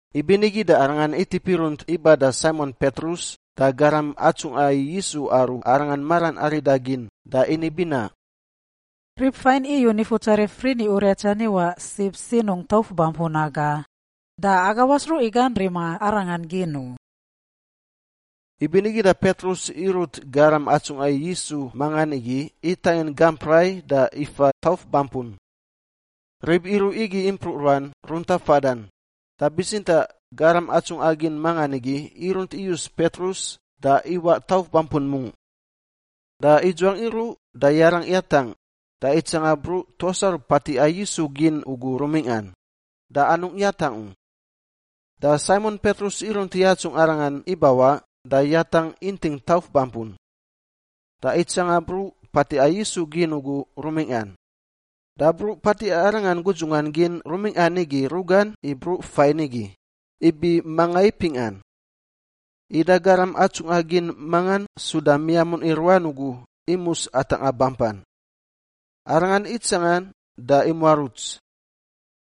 Ibinigi da arangan itip irunt iba da Saimon Petrus da garam atsungꞌa i Yisu aru Arangan maran arida gin da ini binaꞌ, “Rib fain iyu Nifutsarif rini uriatsan iwaꞌ sib sinungꞌ tauf bampun aga, da aga wasruꞌ i gan rima Arangan gin u!” Ibinigi da Petrus irut garam atsungꞌa i Yisu mangan igi itangin gamp rai da ifa tauf bampun. Rib iruꞌ igi impruꞌ ruan runta fadan, da bitsintaꞌ garam atsungꞌa gin mangan igi irunt iyus Petrus da iwaꞌ tauf bampun mungꞌ. Da idzuangꞌ iruꞌ da yarangꞌ yatangꞌ da itsanga bruꞌ tuas aru patiꞌa Yisu gin ugu rumingꞌan, da anungꞌ yatangꞌ u. Da Saimon Petrus irunt yatsungꞌ arangan ibawaꞌ da yatangꞌ inting tauf bampun. Da itsanga bruꞌ patiꞌa Yisu gin ugu rumingꞌan da bruꞌ patiꞌa Aranga gudzunggan gin rumingꞌan nigi rugan i bruꞌ fain igi, ibi manga ipingꞌan. Ida garam atsungꞌa gin mangan suda miamun i ruan ugu imus atangꞌa bampan. Arangan itsangan da imuaruts.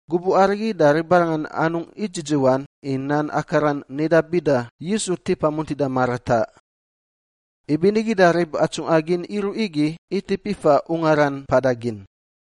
Gubuꞌ arigi da ribarangan anungꞌ idzidziwan i nan akaran nida bida Yisu tipa muntida marataꞌ. Ibinigi da rib atsungꞌa gin iruꞌ igi itip ifa ungaran mpada gin.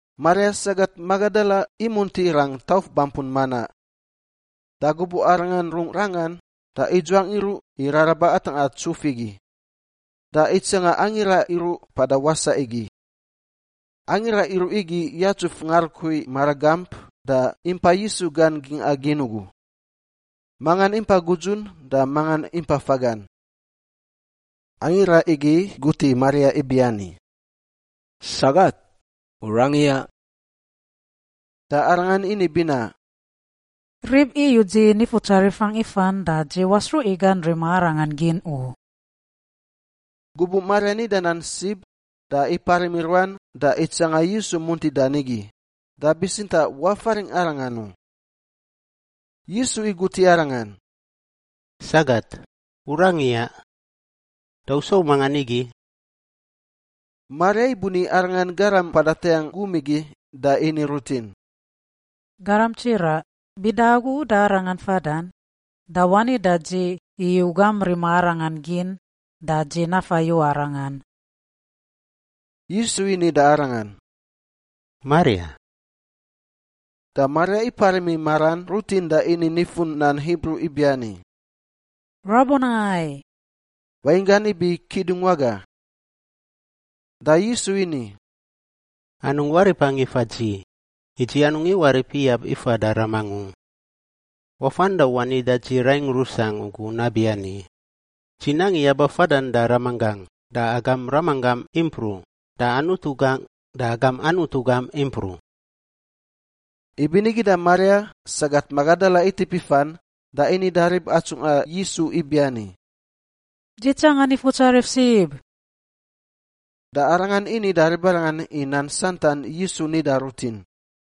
Maria sagat Magadala imunti irang tauf bampun manaꞌ. Da gubuꞌ arangan rungꞌ rangan da idzuangꞌ iruꞌ i raraba atangꞌa ntsuf igi, da itsanga angira iruꞌ mpada wasaꞌ igi. Angira iruꞌ igi yatsuf ngarukui maragamp da impa Yisu gan gingꞌa gin ugu. Mangan impa gudzun da mangan impa fagan. Angira igi gut i Maria ibiani, “Sagat, u rang iyaꞌ?” Da arangan ini binaꞌ, “Rib iyu dzi Nifutsarifangꞌ ifan da dzi wasruꞌ i gan rima Arangan gin u.” Gubuꞌ Maria nida nan sib, da iparim i ruan da itsanga Yisu muntidan nigi, da bitsintaꞌ wafaringꞌ Arangan u. Yisu igut i arangan, “Sagat, u rang iyaꞌ? Da u sau mangan igi?” Maria ibuni Arangan garam mpada tayangꞌ gum igi da ini rutin, “Garam tsiraꞌ, bida agu uda Arangan fadan, da wani da dzi i u gam rima Arangan gin da dzi nafayu Arangan.” Yisu ini da arangan, “Maria.” Da Maria iparim i maran rutin da ini i nifun nan Hibru ibiani, “Rabonai!” (wainggan ibi “Kidungwaga”). Da Yisu ini, “Anungꞌ waripa ngifa dzi, i dzi anungꞌ iwarip iyab ifa da Ramangꞌ u. Wafan da wani da dzi raingꞌ rusangꞌ ugu nabiani, ‘Dzi nang i yaba fadan da Ramanggangꞌ da agam Ramanggam impruꞌ, da Anutu gangꞌ da agam Anutu gam impruꞌ.’” Ibinigi da Maria sagat Magadala itip ifan da ini da rib atsungꞌa Yisu ibiani, “Dzi tsanga Nifutsarif sib!” Da arangan ini da ribarangan i nan santan Yisu nida rutin.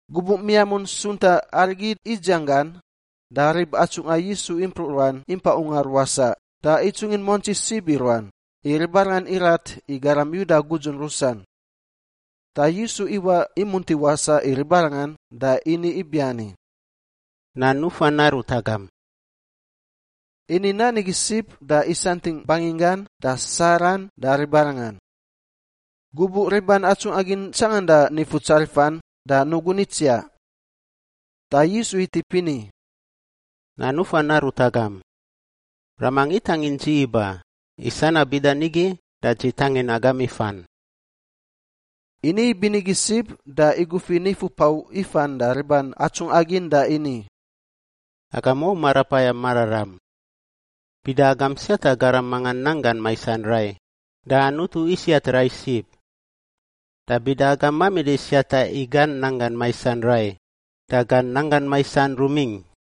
Gubuꞌ miamun Suntaꞌ arigi idziang gan da rib atsungꞌa Yisu impruꞌ ruan impa ungar wasaꞌ da itsungin muantsi sib i ruan, i ribarangan irat i garam Yuda gudzun rusan. Da Yisu iwaꞌ imunti wasaꞌ i ribarangan da ini ibiani, “Nan nufan narut agam!” Ini nan igi sib da isantingꞌ banginggan da saran da ribarangan. Gubuꞌ riban atsungꞌa gin tsanganda Nifutsarifan da nugun itsiaꞌ. Da Yisu itip ini, “Nan nufan narut agam! Ramangꞌ itangin dzi iba, i sanab bida nigi da dzi tangin agam ifan.” Ini ibinigi sib da igufi nifu pau ifan da riban atsungꞌa gin da ini, “Agam wau Marapayam Mararam. Bida agam siata garam mangan nanggan maisan rai, da Anutu isiat rai sib. Da bida agam mamida siata i gan nanggan maisan rai, da gan nanggan maisan rumingꞌ.”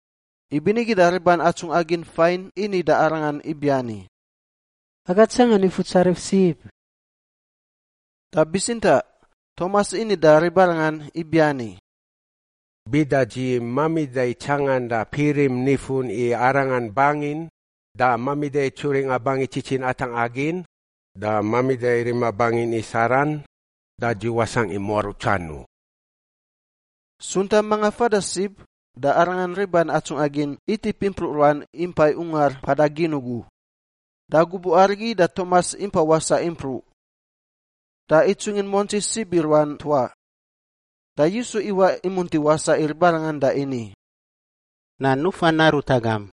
Ibinigi da riban atsungꞌa gin fain ini da arangan ibiani, “Aga tsanga Nifutsarif sib!” Da bitsintaꞌ Tomas ini da ribarangan ibiani, “Bida dzi mamida i tsanganda pirim nifun i Arangan bangin da mamida i tsuringꞌa bangi tsitsin atangꞌa gin da mamida i rima bangingꞌ i saran, da dzi wasangꞌ i muarutsan u.” Suntaꞌ manga fada sib da Arangan riban atsungꞌa gin itip impruꞌ ruan impai ungar mpada gin ugu, da gubuꞌ arigi da Tomas impa wasaꞌ impruꞌ. Da itsungin muantsi sib i ruan ntuaꞌ. Da Yisu iwaꞌ imunti wasaꞌ i ribarangan da ini, “Nan nufan narut agam!”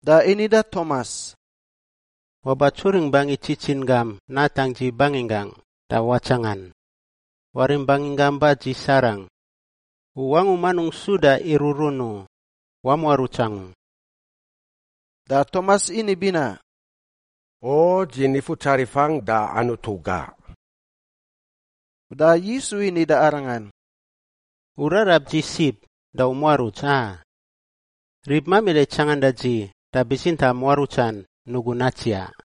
Da ini da Tomas, “Waba tsuringꞌ bangi tsitsinggam natangꞌ dzi banginggangꞌ da watsangan. Warim bangim ba dzi sarangꞌ. U wangum anungꞌ suda iruꞌrun u; wamuaruts angu.” Da Tomas ini binaꞌ, “O, dzi Nifutsarifangꞌ da Anutu gangꞌ!” Da Yisu ini da arangan, “U rarab dzi sib da u muaruts, a? Rib mamida tsanganda dzi da bitsintaꞌ muarutsan nugun natsiaꞌ.”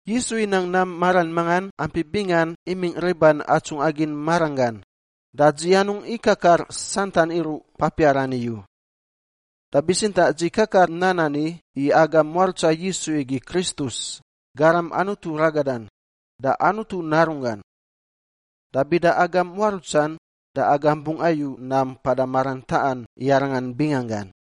Yisu inang nam maran mangan ampi bingan imingꞌ riban atsungꞌa gin maranggan, da dzi anungꞌ ikakar santan iruꞌ papiar ani u. Da bitsintaꞌ dzi kakar nan ani i agam muarutsa Yisu igi Kristus, Garam Anutu Ragadan, da Anutu Narunggan. Da bida agam muarutsan da agam bungꞌ ayu nam mpada maran taꞌan i Arangan binganggan.